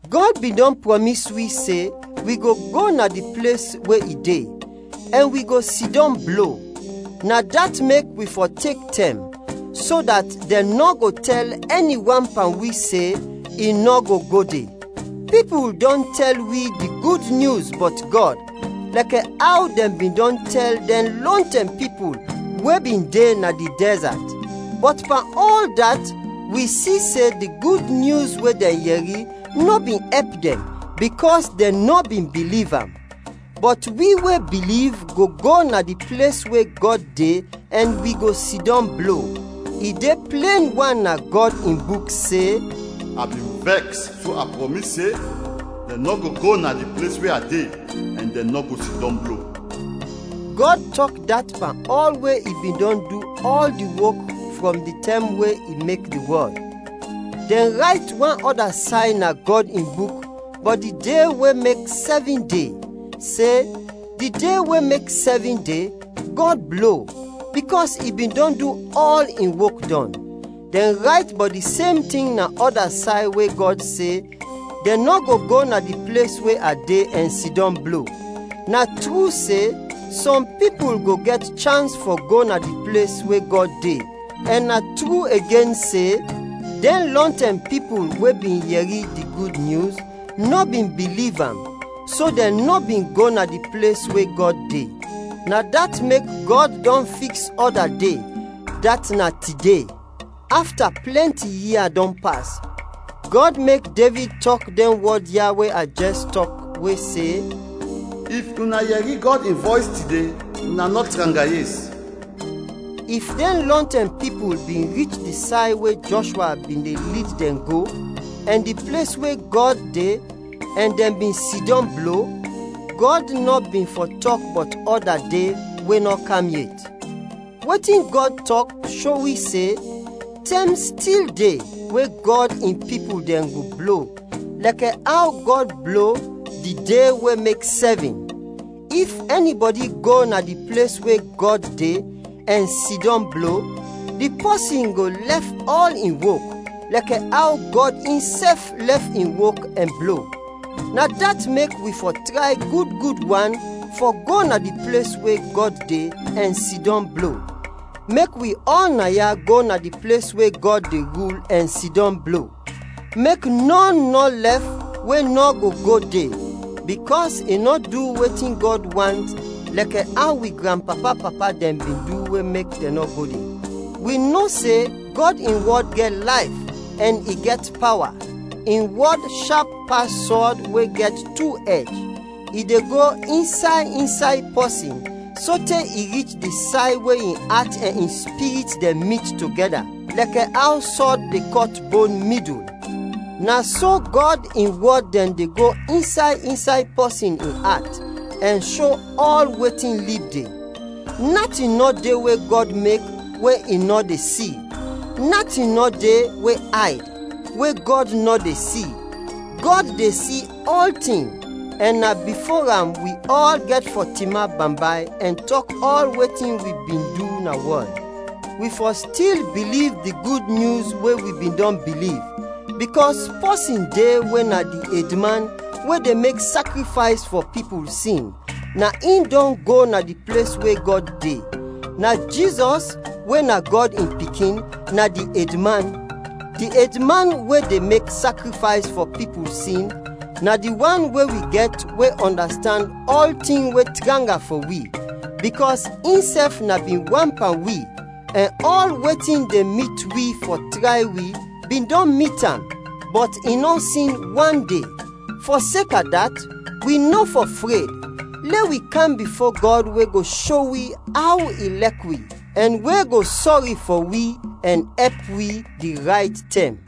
Gɔd bin dɔn prɔmis wi se, wi go go na di ples we i de, ɛn wi go sidɔm blo. Na dat mek wi fɔ tek tɛm, so dat dɛn nɔ go tɛl ɛni wan pan wi se, i nɔ go go de. Pipul dɔn tɛl wi di Gud Nyus bɔt Gɔd, lɛkɛ aw dɛn bin dɔn tɛl dɛn lɔntɛm pipul we bin de na di dɛzat; bɔt pan ɔl dat wi si se di Gud Nyus we dɛn yɛri, nɔ bin ɛp dɛn, bikɔs dɛn nɔ bin biliv am. Bɔt wi we biliv go go na di ples we Gɔd de ɛn wi go sidɔm blo. I de plen wan na Gɔd in Buk se, “A bin vɛks so a prɔmis se, dɛn nɔ go go na di ples we a de ɛn dɛn nɔ go sidɔm blo.” Gɔd tɔk dat pan ɔl we i bin dɔn du ɔl di wok frɔm di tɛm we i mek di wɔl. Dɛn rayt wan ɔda say na Gɔd in Buk bɔt di de we mek sɛvin de, se, “Di de we mek sɛvin de, Gɔd blo, bikɔs i bin dɔn du ɔl in wok dɔn.” Dɛn rayt bɔt di sem tin na ɔda say we Gɔd se, “Dɛn nɔ go go na di ples we a de ɛn sidɔm blo.” Na tru se, sɔm pipul go gɛt chans fɔ go na di ples we Gɔd de, ɛn na tru igen se, dɛn lɔntɛm pipul we bin yɛri di Gud Nyus, nɔ bin biliv am, so dɛn nɔ bin go na di ples we Gɔd de. Na dat mek, Gɔd dɔn fiks ɔda de, dat na “Tide”. Afta plɛnti ia dɔn pas, Gɔd mek Devid tɔk dɛn wɔd ya we a jɛs tɔk, we se, “If una yɛri Gɔd in vɔys tide, una nɔ tranga yes.” If dɛn lɔntɛm pipul bin rich di say we Jɔshwa bin de lid dɛn go, ɛn di ples we Gɔd de ɛn dɛn bin sidɔm blo, Gɔd nɔ bin fɔ tɔk bɔt ɔda de we nɔ kam yet. Wetin Gɔd tɔk sho wi se, tɛm stil de we Gɔd in pipul dɛn go blo lɛkɛ aw Gɔd blo di de we mek sɛvin. If ɛnibɔdi go na di ples we Gɔd de ɛn sidɔm blo, di pɔsin go lɛf ɔl in wok, lɛkɛ aw Gɔd insɛf lɛf in wok ɛn blo. Na dat mek, wi fɔ tray gud gud wan fɔ go na di ples we Gɔd de ɛn sidɔm blo. Mek wi ɔl naya go na di ples we Gɔd de rul ɛn sidɔm blo, mek nɔn nɔ lɛf we nɔ go go de bikɔs i nɔ du wetin Gɔd want lɛkɛ aw wi granpapa-papa dɛn bin du we mek dɛn nɔ go de. Wi no se Gɔd in wɔd gɛt layf ɛn i gɛt pawa. In wɔd shap pas sɔd we gɛt tu ɛj. I de go insay insay pɔsin sote i rich di say we in at ɛn in spirit dɛn mit togɛda, lɛkɛ aw sɔd de kɔt bon midul. Na so Gɔd in wɔd dɛn de go insay insay pɔsin in at ɛn sho ɔl wetin lib de. Natin nɔ de we Gɔd mek we i nɔ de si; natin nɔ de we ayd, we Gɔd nɔ de si; Gɔd de si ɔltin, ɛn na bifo am wi ɔl gɛt fɔ tinap bambay ɛn tɔk ɔl wetin wi bin du na wɔl. Wi fɔ stil biliv di Gud Nyus we wi bin dɔn biliv, bikɔs pɔsin de we na di edman we de mek sakrifays fɔ pipul sin, na in dɔn go na di ples we Gɔd de. Na Jizɔs, we na Gɔd in Pikin, na di edman. Di edman we de mek sakrifays fɔ pipul sin na di wan we wi gɛt we ɔndastand ɔltin we tranga fɔ wi, bikɔs insɛf na bin wan pan wi, ɛn ɔl wetin de mit wi fɔ tray wi bin dɔn mit am. Bɔt i nɔ sin wande. Fɔseka dat, wi nɔ fɔ fred. Lɛ wi kam bifo Gɔd we go sho wi aw i lɛk wi, ɛn we go sɔri fɔ wi, ɛn ɛp wi di rayt tɛm.